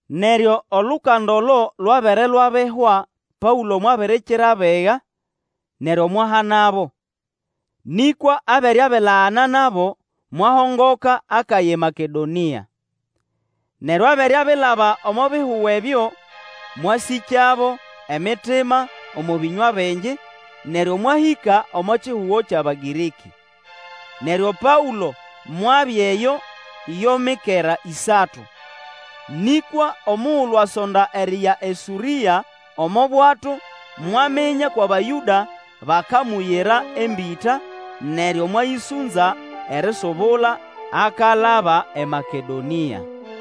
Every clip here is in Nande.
Neryo olukanda olo lwabere lwabihwa, Paũlo mwabirikira abiga, neryo mwahanabo, nĩkwa abere abilagana nabo, mwahongoka akaya eMakedonĩa. Neryo abere abilaba omo bihugo ebyo, mwasĩkyabo emitima omo bĩnywa bingi, neryo mwahĩka omo kihugo kyʼAbagĩrĩkĩ. Neryo Paũlo mwabya eyo yo mikera ĩsatu. Nĩkwa omugulu asonda eriya eSũrĩa omo bwato, mwaminya kwʼAbayũda bakamuyira embĩta, neryo mwayĩsũnza erisubula akalaba eMakedonĩa.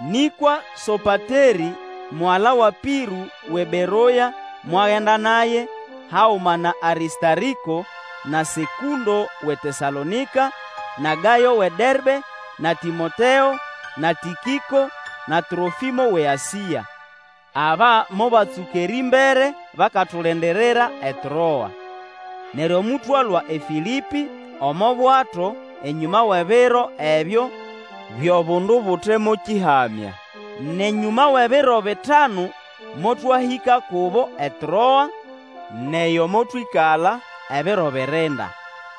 Nĩkwa Sopaterĩ, mugala wa Pĩrũ, wʼeBeroya, mwagenda naye, haguma na Arĩstarĩko, na Sekũndo wʼeTesalonĩka, na Gayo wʼeDerbe, na Tĩmoteo, na Tĩkĩko, na Trofĩmo wʼeAsĩa. Aba mobatsũka erĩmbere, bakatulindirira eTroa. Neryo motwalũa eFĩlĩpĩ omo bwato enyũma wʼebiro ebyo byʼobundu Bute mo Kĩhamya. Nʼenyũma wʼebiro bitanu motwahĩka kubo eTroa, nʼeyo motwĩkala ebiro birinda.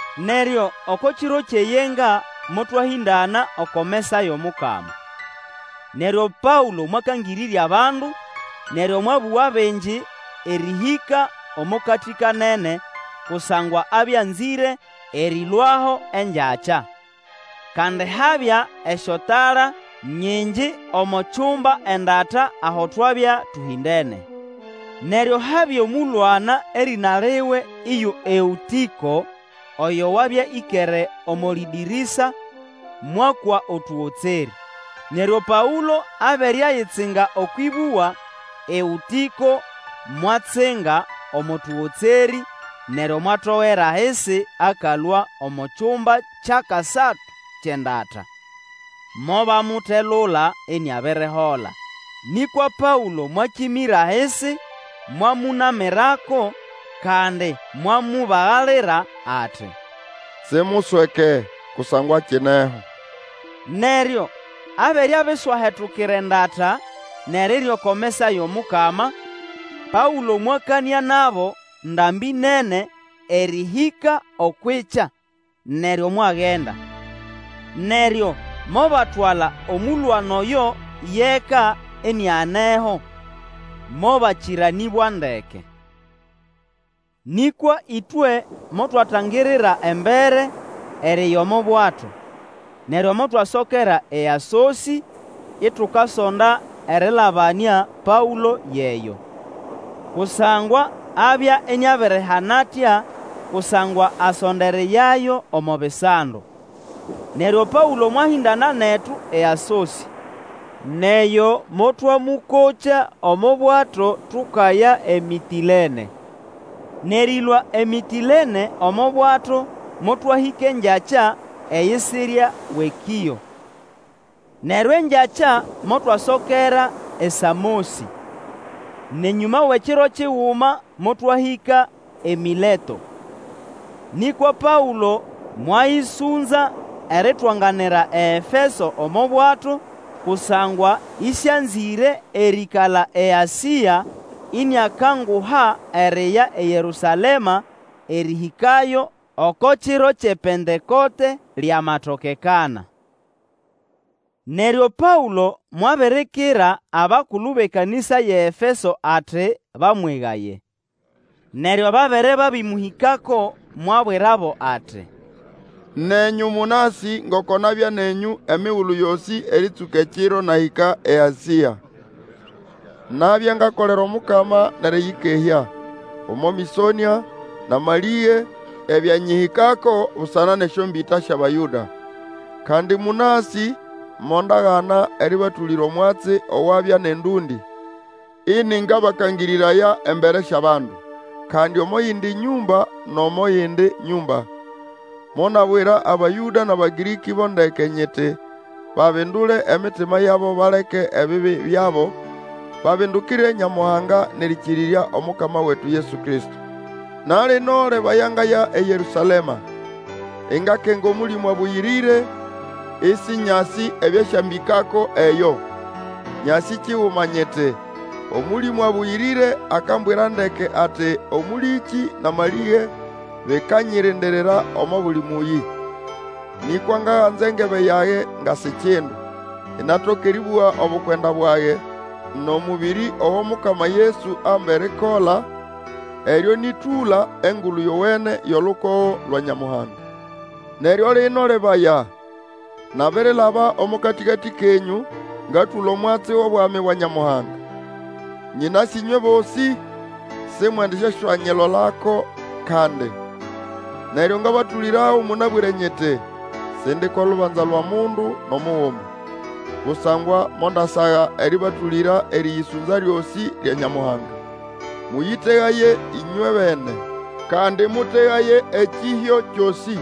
Neryo oko kiro kyʼeyenga motwahĩndana oko mesa yʼomukama. Neryo Paũlo mwakangĩrĩrya bandu, neryo mwabũga bingi erĩhĩka omo katĩkanene, kusangwa abya anzĩre erĩlũaho engyakya. Kandi habya esyotala nyingi omo kyumba kyʼendata aho twabya tũhĩndene. Neryo habya omũlwana erĩna liwe iyo Eũtĩko oyo wabya ĩkere omo lĩdĩrĩsa mwakwa otũgotserĩ. Neryo Paũlo abere ayitsinga okwʼĩbũga, Eũtĩko mwatsinga omo tũgotsĩ neryo mwatogera ahisi akalũa omo kyumba kyʼakasatu kyʼendata. Mobamutelula iniabirihola. Nĩkwa Paũlo mwakĩmĩra ahisi mwamũnamĩrako, kandi mwamubagalira ati, simusweke kusangwa akineho. Neryo abere abiswahetukira endata, nʼerirya oko mesa yʼomukama, Paũlo mwakanĩa nabo ndambĩ nene erĩhĩka okwʼikya, neryo mwagenda. Neryo mobatwala omũlwana oyo yʼeka inianeho, mobakĩranĩbwa ndeke. Nĩkwa ĩtwe motwatangirira embere eriya omo bwato, neryo motwasokera eAsosĩ, itukasonda erĩlabamĩa Paũlo yʼeyo. Kusangwa abya iniabirihana atya, kusangwa asonda eriyayo omo bisando. Neryo Paũlo mwahĩndana netu eAsosĩ, nʼeyo motwamũkokya omo bwato tukaya eMĩtĩlene. Nʼerĩlũa eMĩtĩlene omo bwato motwahĩka engyakya eyisirya wʼeKĩo. Neryo engyakya motwasokera eSamosĩ. Nʼenyũma wʼekiro kiguma motwahĩka eMĩleto. Nĩkwa Paũlo mwayĩsũnza eritwanganira eEfeso omo bwato, kusangwa ĩsĩanzĩre erĩĩkala eAsĩa, iniakanguha eriya eYerũsalema erĩhĩkayo oko kiro kyʼePentekote, lyamatokekana. Neryo Paũlo mwabirikira abakulu bʼekanĩsa yʼeEfeso ati bamwegaye. Neryo babere babĩmũhĩkako, mwabwirabo ati, Nenyũ mũnasĩ ngoko nabya nenyũ emigulu yosĩ erĩtsũka ekiro nahĩka eAsĩa. Nabya ngakolera Omukama nʼerĩyĩkehya, omo mĩsonĩa, nʼamalĩge ebyanyĩhĩkako busana nʼesyombĩta syʼAbayũda. Kandi mũnasĩ mondagana erĩbatũlĩra omwatsi owabya nʼendũndĩ, ĩnĩngabakangĩrĩraya embere syʼabandu, kandi omo yindi nyũmba nʼomo yindi nyũmba. Monabwira Abayũda nʼAbagĩrĩkĩ bo ndeke nyiti babindule emitima yabo baleke ebibi byabo, babindukire Nyamuhanga nʼerĩkĩrĩrya Omukama wetu Yesu Kristo. Na lino, lebaya ngaya eYerũsalema, ingakenga Omũlĩmũ Abũyĩrĩre, Ĩsĩnyasĩ ebyasyambĩkako eyo. Nyasĩ kiguma, nyiti, Omũlĩmũ Abũyĩrĩre akambwira ndeke ati omũlĩkĩ nʼamalĩge bikanyirindirira omo buli mũyĩ. Nĩkwa ngaganza engebe yage nga si kindu, inatoka eribuga obukwenda bwage, nʼomũbĩrĩ ogo Mukama Yesu amba erikola, eryo nĩ tũla Engulu Yowene yʼolukogo lwa Nyamuhanga. Neryo lino, lebaya, nabirilaba omo katĩkatĩ kenyũ, ngatũla omwatsi wʼobwami bwa Nyamuhanga. Nyĩnasĩ ĩnywe bosĩ Simwendisyaswanyilolako kandi. Neryo ngabatũlĩrago mũnabwĩre nyiti, Sindi ko lubanza lwʼomundu nʼomuguma. Kusangwa mondasaga erĩbatũlĩra erĩyĩsũnza lyosĩ lya Nyamuhanga. Mũyĩtegaye ĩnywebene, kandi mũtegaye ekĩhyo kyosĩ,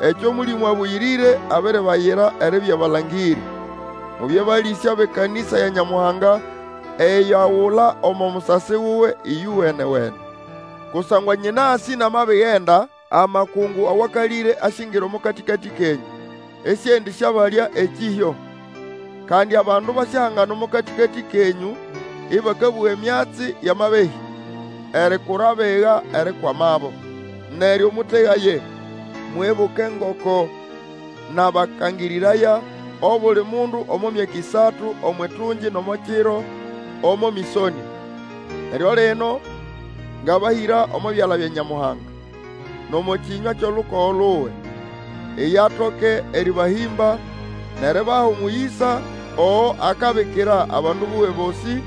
ekyo Mũlĩmũ Abũyĩrĩre abiribayira eribya balangĩrĩ. Mubye balĩsya bʼekanĩsa ya Nyamuhanga eyo agula omo musasi wuwe ĩyowene-wene. Kusangwa nyĩnasĩ namabigenda, amakungu awakalĩre asyingira omo katĩkatĩ kenyũ, Ĩsĩendĩsyabalya ekĩhyo. Kandi abandu basyahangana omo katĩkatĩ kenyũ, ĩbakabũga emyatsi yʼamabehĩ, erikura abiga erikwamabo. Neryo mũtegaye, mwibuke ngoko nabakangĩrĩraya, obuli mundu omo myaka ĩsatu omwʼitungi nʼomo kiro, omo mĩsonĩa. Neryo lino ngabahĩra omo byala bya Nyamuhanga, nʼomo kĩnywa kyʼolukogo luwe. Iye atoke erĩbahĩmba, nʼeribaha omũyĩsa ogo akabikira abandu buwe bosĩ,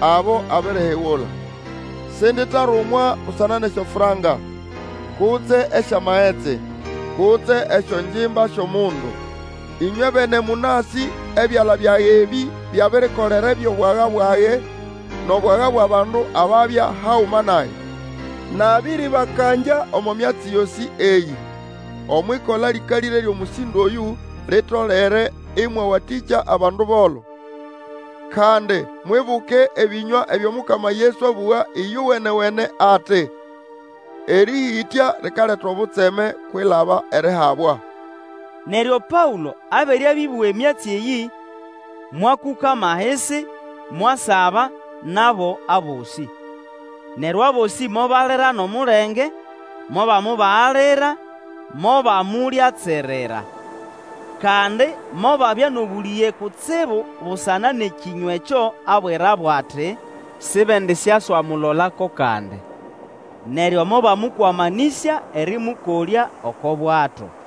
abo abirihigula. Sinditarumwa busana nʼesyofranka, kutse esyamagetsi, kutse esyongimba syʼomundu. Ĩnywebene mũnasĩ ebyala byage ebĩ byabirikolera ebyʼobwaga bwage, nʼobwaga bwʼabandu ababya haguma nage. Nabĩrĩbakangya omo myatsi yosĩ eyĩ, omwʼikola lĩkalĩre lyʼomũsĩndo oyũ, litolere ĩmwawatĩkya abandu bolo, kandi mwibuke ebĩnywa ebyo Mukama Yesu abũga ĩyowenewene ati, Erĩhĩtya likaleta obutseme kwilaba erihabwa. Neryo Paũlo abere abĩbũga emyatsi eyĩ, mwakũkama ahisi, mwasaba nabo abosĩ, Neryo abosĩ mobalira nʼomulenge, mobamubagalira, mobamulyatsirira. Kandi mobabya nʼobũlĩge kutsibu busana nʼekĩnywa ekyo abwirabo ati, sibendisyaswamulolako kandi. Neryo mobamũkwamanĩsya erĩmũkolya oko bwato.